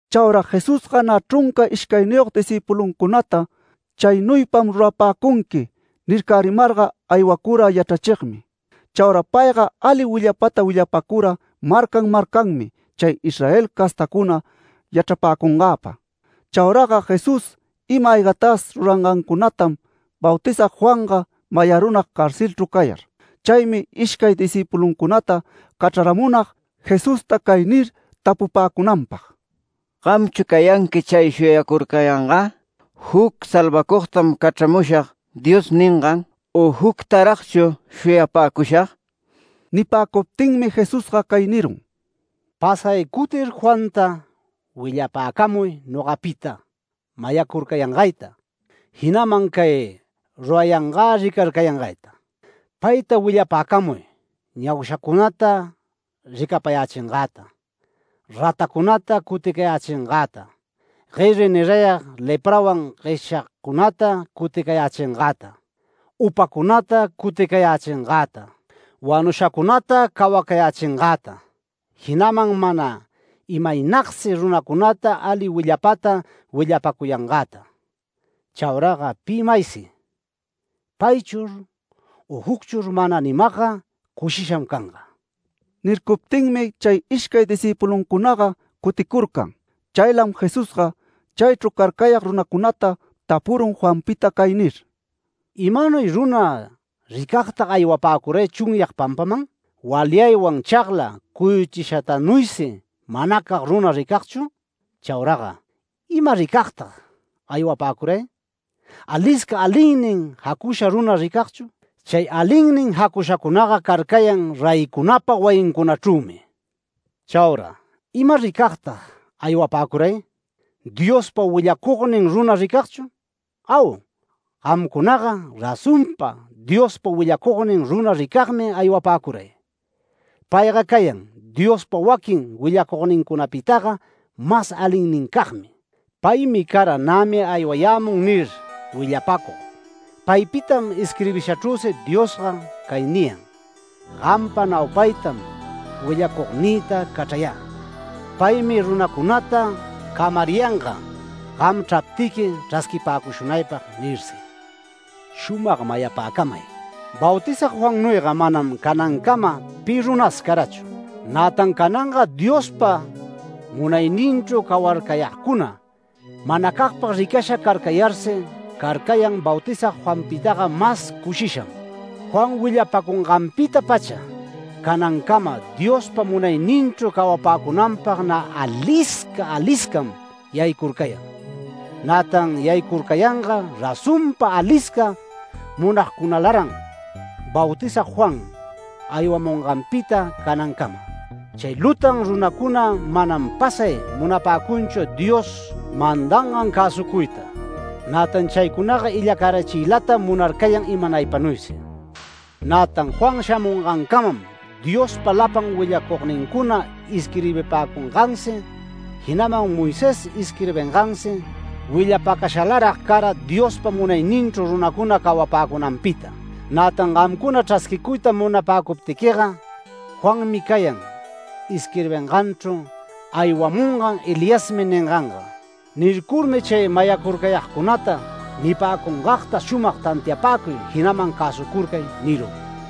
Chaura Jesusga nä chrunca ishcayniyog discïpuluncunata “Chaynuypam rurapäcunqui” nircärimarga aywacura yachrachigmi. Chaura payga ali willapata willapacura marcan marcanmi chay Israel castacuna yachrapäcungäpa. Chauraga Jesús ima-aygatas rurayangantam Bautizag Juanga mayarunag carcelchru cayar. Chaymi ishcay discïpuluncunata cachraramunag Jesusta cay nir tapupäcunanpag: “¿Gamchu cayanqui chay shuyacurcayangä, ‘Juc salvacugtam cachramushag’ Dios ningan, u juctaragchu shuyapäcushag?” Nipäcuptinmi Jesusga cay nirun: “Pasay cutir Juanta willapäcamuy nogapita mayacurcayangayta, jinaman cay rurayangä ricarcayangayta. Payta willapäcamuy ñaushacunata ricapayächingäta, ratacunata cuticayächingäta, gueri nirayag leprawan gueshyagcunata cuticayächingäta, upacunata cuticayächingäta, wanushacunata cawacayächingäta, jinaman mana imaynagsi runacunata ali willapata willapacuyangäta. Chauraga pi maysi ‘Paychur u jucchur’ mana nimagga cushisham canga”. Nircuptinmi chay ishcay discïpuluncunaga cuticurcan. Chaylam Jesusga chaychru carcayag runacunata tapurun Juanpita cay nir: “¿Imanuy runa ricagtag aywapäcuray chunyag pampaman? ¿Walyaywan chagla cuyuchishatanuysi manacag runa ricagchu? Chauraga ¿ima ricagtag aywapäcuray? ¿Alisca alinnin jacusha runa ricagchu? Chay alinnin jacushacunaga carcayan reycunapa wayincunachrümi. Chaura ¿ima ricagtag aywapäcuray? ¿Diospa willacugnin runa ricagchu? Au, gamcunaga razonpa Diospa willacugnin runa ricagmi aywapäcuray. Payga cayan Diospa waquin willacugnincunapitaga mas alinnincagmi. Paymi cara ‘Nämi aywayämun’ nir willapacug. Paypitam isquirbishachrüsi Diosga cay niyan: ‘Gampa naupaytam willacugnïta cachrayä, paymi runacunata camariyanga. Gam chraptiqui chrasquipäcushunaypag’ nirsi. Shumag mayapäcamay: Bautizag Juannuyga manam canancama pi runas carachu. Nätan cananga Diospa munayninchru cawacagcuna manacagpag ricasha carcayarsi carcayan Bautizag Juanpitaga mas cushisham. Juan willapacunganpita-pacha canancama Diospa munayninchru cawapäcunanpag nä alisca aliscam yaycurcayan. Nätan yaycurcayanga razonpa alisca munagcunalaran Bautizag Juan aywamunganpita canancama. Chay lutan runacuna manam pasay munapäcunchu Dios mandangan cäsucuyta, nätan chaycunaga illacarachiylatam munarcayan imanaypanuysi. Nätan Juan shamungancamam Diospa lapan willacugnincuna isquirbipäcungansi jinaman Moisés isquirbingansi willapacashalarag cara Diospa munayninchru runacuna cawapäcunanpita. Nätan gamcuna chrasquicuyta munapäcuptiquiga, Juanmi cayan isquirbinganchru ‘Aywamunga Eliasmi’ ninganga”. Nircurmi chay mayarcurcayagcunata “Nipäcungagta shumag tantiapäcuy jinaman cäsucurcay” nirun.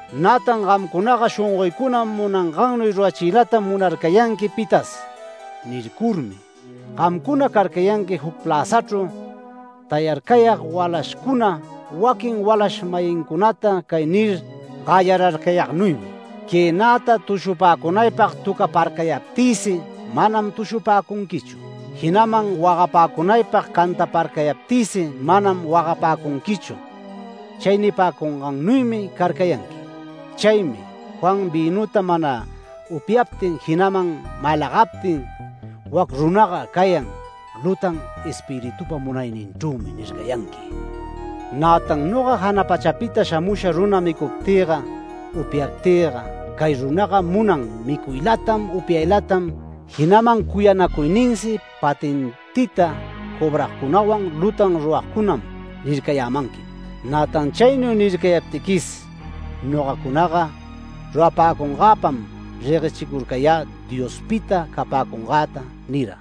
“Nätan gamcunaga shongoycuna munangannuy rurachiylatam munarcayanqui pitas” nircurmi, “Gamcuna carcayanqui juc pläzachrüchu tayarcayag walashcuna waquin walash-mayincunata cay nir gayararcayagnuymi: ‘Quënata tushupäcunaypag töcaparcayaptïsi manam tushupäcunquichu. Jinaman wagapäcunaypag cantaparcayaptïsi manam wagapäcunquichu’ chay nipäcugnuymi carcayanqui. Chaymi Juan vïnuta mana upyaptin jinaman malagaptin, ‘Wac runaga cayan lutan espiritupa munayninchrümi’ nircayanqui. Nätan noga jana pachapita shamusha runa micuptïga upyaptïga, ‘Cay runaga munan micuylatam, upyaylatam, jinaman cuyanacuyninsi patentita cobragcunawan lutan ruragcunam’ nircayämanqui. Nätan chaynuy nircayaptiquis nogacunaga rurapäcungäpam reguechicurcayä Diospita capäcungäta” nira.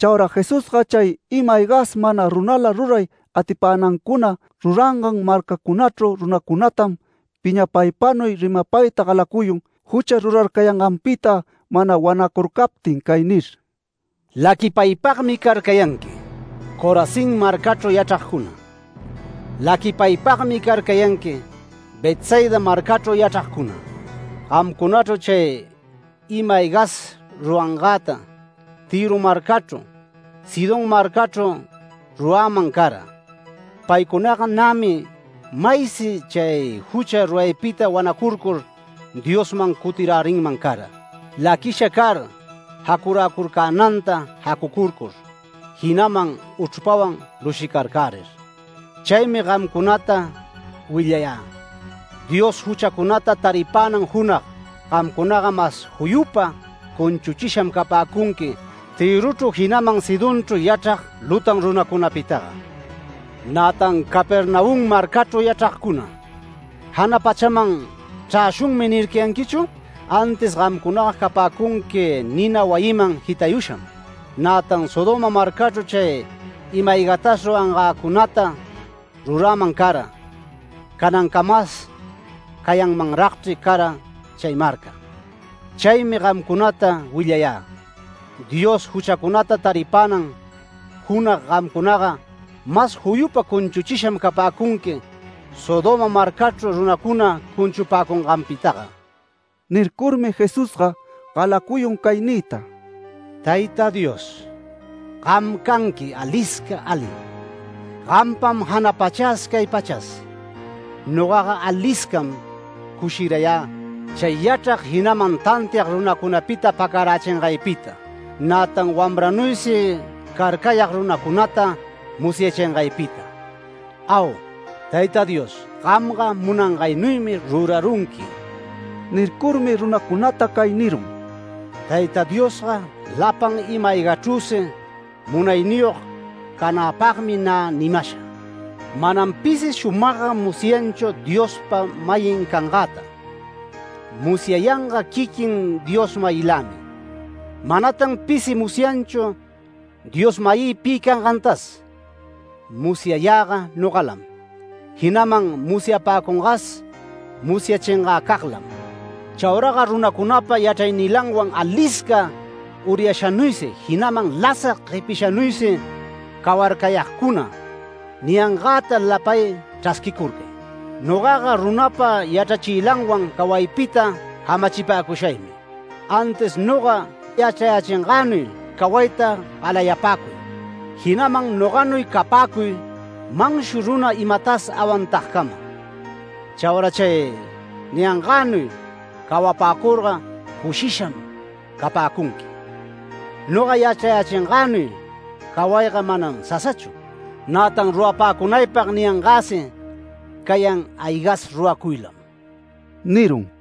Chaura Jesusga chay ima-aygas mana runala ruray atipänancuna rurangan marcacunachru runacunatam piñapaypanuy rimapayta galacuyun, jucha rurarcayanganpita mana wanacurcaptin cay nir: “¡Laquipaypagmi carcayanqui, Corazín marcachru yachragcuna! ¡Laquipaypagmi carcayanqui, Betsaida marcachru yachragcuna! Gamcunachru chay ima-aygatas rurangäta Tïro marcachru, Sidón marcachru ruräman cara, paycunaga nämi maysi chay jucha ruraypita wanacurcur Diosman cutirärinman cara, laquisha car jacuräcurcänanta jacucurcur, jinaman uchrpawan lushicarcärir. Chaymi gamcunata willayä: Dios juchacunata taripänan junag gamcunaga mas juyupa cunchuchisham capäcunqui Tïrochru jinaman Sidonchru yachrag lutan runacunapitaga. Nätan Capernaum marcachru yachragcuna, ¿‘Jana pachaman chräshunmi’ nircayanquichu? Antis gamcunaga capäcunqui nina wayiman jitayusham. Nätan Sodoma marcachru chay ima-aygatas rurangäcunata ruräman cara, canancamas cayanmanragchri cara chay marca. Chaymi gamcunata willayä: Dios juchacunata taripänan junag gamcunaga mas juyupa cunchuchisham capäcunqui Sodoma marcachru runacuna cunchunganpitaga”. Nircurmi Jesusga galacuyun cay niyta: “Tayta Dios, gam canqui alisca alim. Gampam jana pachas cay pachas. Nogaga aliscam cushirayä chay yachrag jinaman tantiag runacunapita pacarachingaypita, nätan wamranuysi carcayag runacunata musyachingaypita. Au Tayta Dios, gamga munangaynuymi rurarunqui”. Nircurmi runacunata cay nirun: “Tayta Diosga lapan ima-aygachrüsi munayniyog cananpagmi nä nimasha. Manam pisi shumagga musyanchu Diospa-mayin cangäta. Musyayanga quiquin Dios-mayilämi. Manatan pisi musyanchu Dios-mayï pi cangantas. Musyayäga nogalam, jinaman musyapapäcungas musyachingäcaglam. Chauraga runacunapa yachrachiylanwan alisca uryashanuysi, jinaman lasag guepishanuysi cawarcayagcuna niyangäta lapay chrasquicurcay. Nogaga runapa yachrachiylanwan cawaypita jamachipäcushaymi. Antis noga yachrayächingänuy cawayta galayapäcuy. Jinaman noganuy capäcuy manshu runa imatas awantagcama. Chaura chay niyangänuy cawapäcurga, cushisham capäcunqui. Noga yachrayächingänuy cawayga manam sasachu. Nätan rurapäcunaypag niyangäsi cayan aygas ruracuylam” nirun.